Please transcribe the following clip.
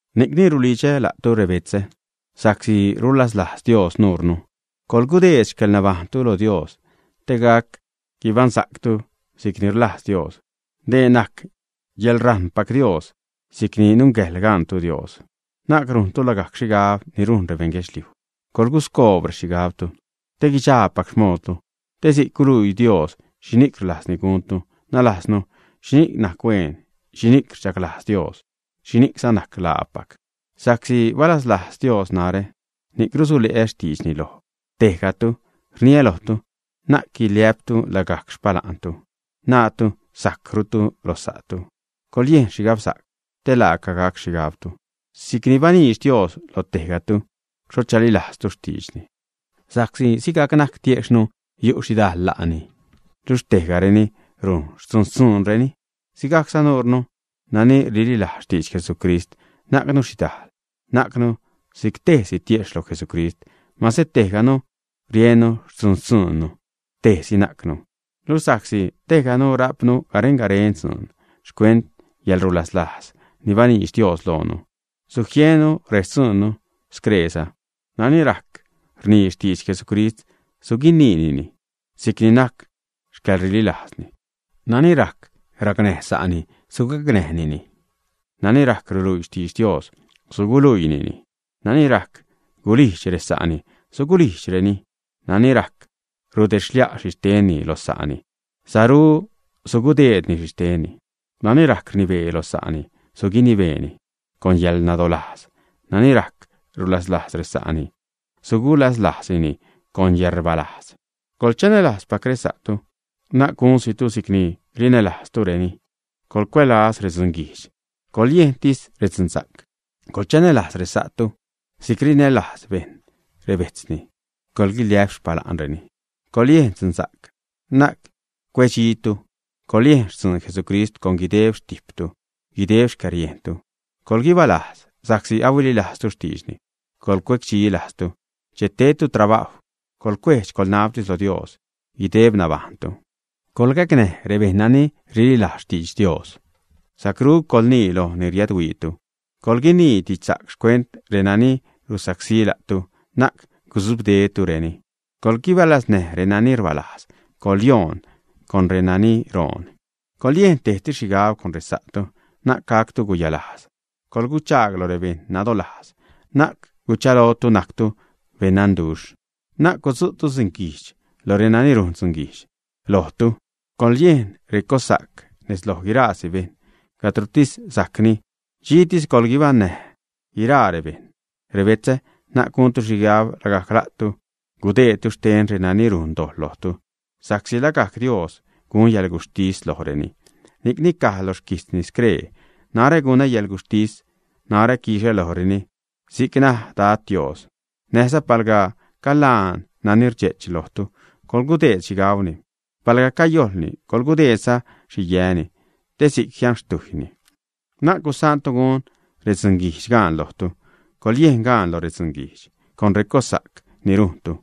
Ni'cni rulidxä la'tu rebetzä, sa'csi rulaslajz Dios nuure, coḻgudeed xcäḻnabajṉtu lo Dios te gac guibaṉsa'ctu si'cni rlajz Dios. Dee najc yäḻrajṉpac Dios si'c ni nungäjḻ gaṉtu Dios. Na'c rujntu lagajc xhigab ni rujn rebeṉ guedxliuj, coḻguscoob rexhigabtu te guidxaapac xmoodtu te si'c guluii Dios xhini'c rlajzni guntu, nalajznu xhini'c najc hueen, xhini'c rdxaglajz Dios, xhini'cza najc laapac. Sa'csi balaslajz Dios narä, ni'c rusule'ä xtiidxni loj tejgatu, rniä lojtu, na'c guiliä'ptu lagajc xpala'ntu, naatu sajcrutu loj sa'tu. Coḻyejn xhigabsa'c, te laaca gac xhigabtu, si'cni baniidx Dios lo tejgatu xho chalilajztu xtiidxni. Sa'csi sigajc najc tiejxhnu, yu' xhidal la'ni, luxh tejgareni rujn xtzuun-xtzuunreni, sigajcza nuure nani rililajz xtidx Jesucrist, najcnu xhidajl, najcnu si'c tejsi tiejxh lo Jesucrist, mase tejganu rujn xtzun-xtzuunnu, tejsi najcnu. Luxh sa'csi tejganu rajpnu garen-garen dzuun xcuent yäḻrulaslajz ni baniidx Dios loonu, sujiennu rextzuunnu screeza: nani rajc rnii xtidx Jesucrist, suguiniinini, si'c ni najc xcäḻrililajzni; nani rajc racnäj sa'ni, sugacnäjni; nani rajc ruluii xtidx Dios, suguluiini; nani rajc gulijdx resa'ni, sugulijdxnireni, nani rajc rudedxlia' xhixtenni lo sa'ni, saru sugudeedni xhixtenni; nani rajc rnibee lo sa'ni, suguinibeeni con yäḻnadolajz; nani rajc rulaslajz resa'ni, sugulaslajzni con yäḻrbalajz. Coḻchanälajzpac resa'tu, na'c gunsitu si'cni rinälajztureni. Coḻcuälaz redzunguijdx, coḻyejntis redzunsa'c. Coḻchanälajz resa'tu si'c rinälajz bejṉ rebejtzni. Coḻguiliä'p xpala'nreni. Coḻyejn dzunsa'c, na'c cuedxitu. Coḻyejn xtzuun Jesucrist con guideb xtijptu, guideb xcäriejntu. Coḻguibalajz sa'csi ahuililajztu xtiidxni. Coḻcuecdxi lajztu che tedtu trabajw. Coḻcuedx-coḻnabtis lo Dios guideb nabajṉtu. Coḻgacnäj rebejṉ nani rililajz xtidx Dios; sacru coḻnii loj ni riädhuiitu. Coḻguinii didxsa'c xcuent renani rusacsí la'tu, na'c gudzubdetureni. Coḻguibalaznäj renani rbalajz, coḻyonnäj renani roon. Coḻyejn tejtis xhigab con resa'tu, na'c gactu guyalajz, colguchaag loj rebeṉ nadolajz. Na'c guchalotu najctu beṉnanduxh. Na'c gudzu'tu dzunguijdx loj renani rujn dzunguijdx lojtu. Coḻyejn recossa'c nez loj guirasi bejṉ. Cadrotis sajcni, dxitis coḻguibaṉnäj guiraa rebejṉ. Rebetzä, na'c guntu xhigab lagajc la'tu gudeedtu xten renani rujn dojḻ lojtu, sa'csi lagajc Dios gun yäḻguxhtis lojreni, ni'cni caj lo xquijtzni scree: “Narä gunä yäḻguxhtis, narä quixä lojreni si'c naj Dad, Dios.” Näjza: “Palga calaan nani rdxe'ch lojtu, coḻgudeed xhi gauni, palga cayojlni, coḻgudeedza xhi yäni, te si'c jianxtiujni.” Na'c gusaantu gun redzunguijdx gaan lojtu, coḻyejn gaan lo dzunguijdx con recossa'c ni rujntu.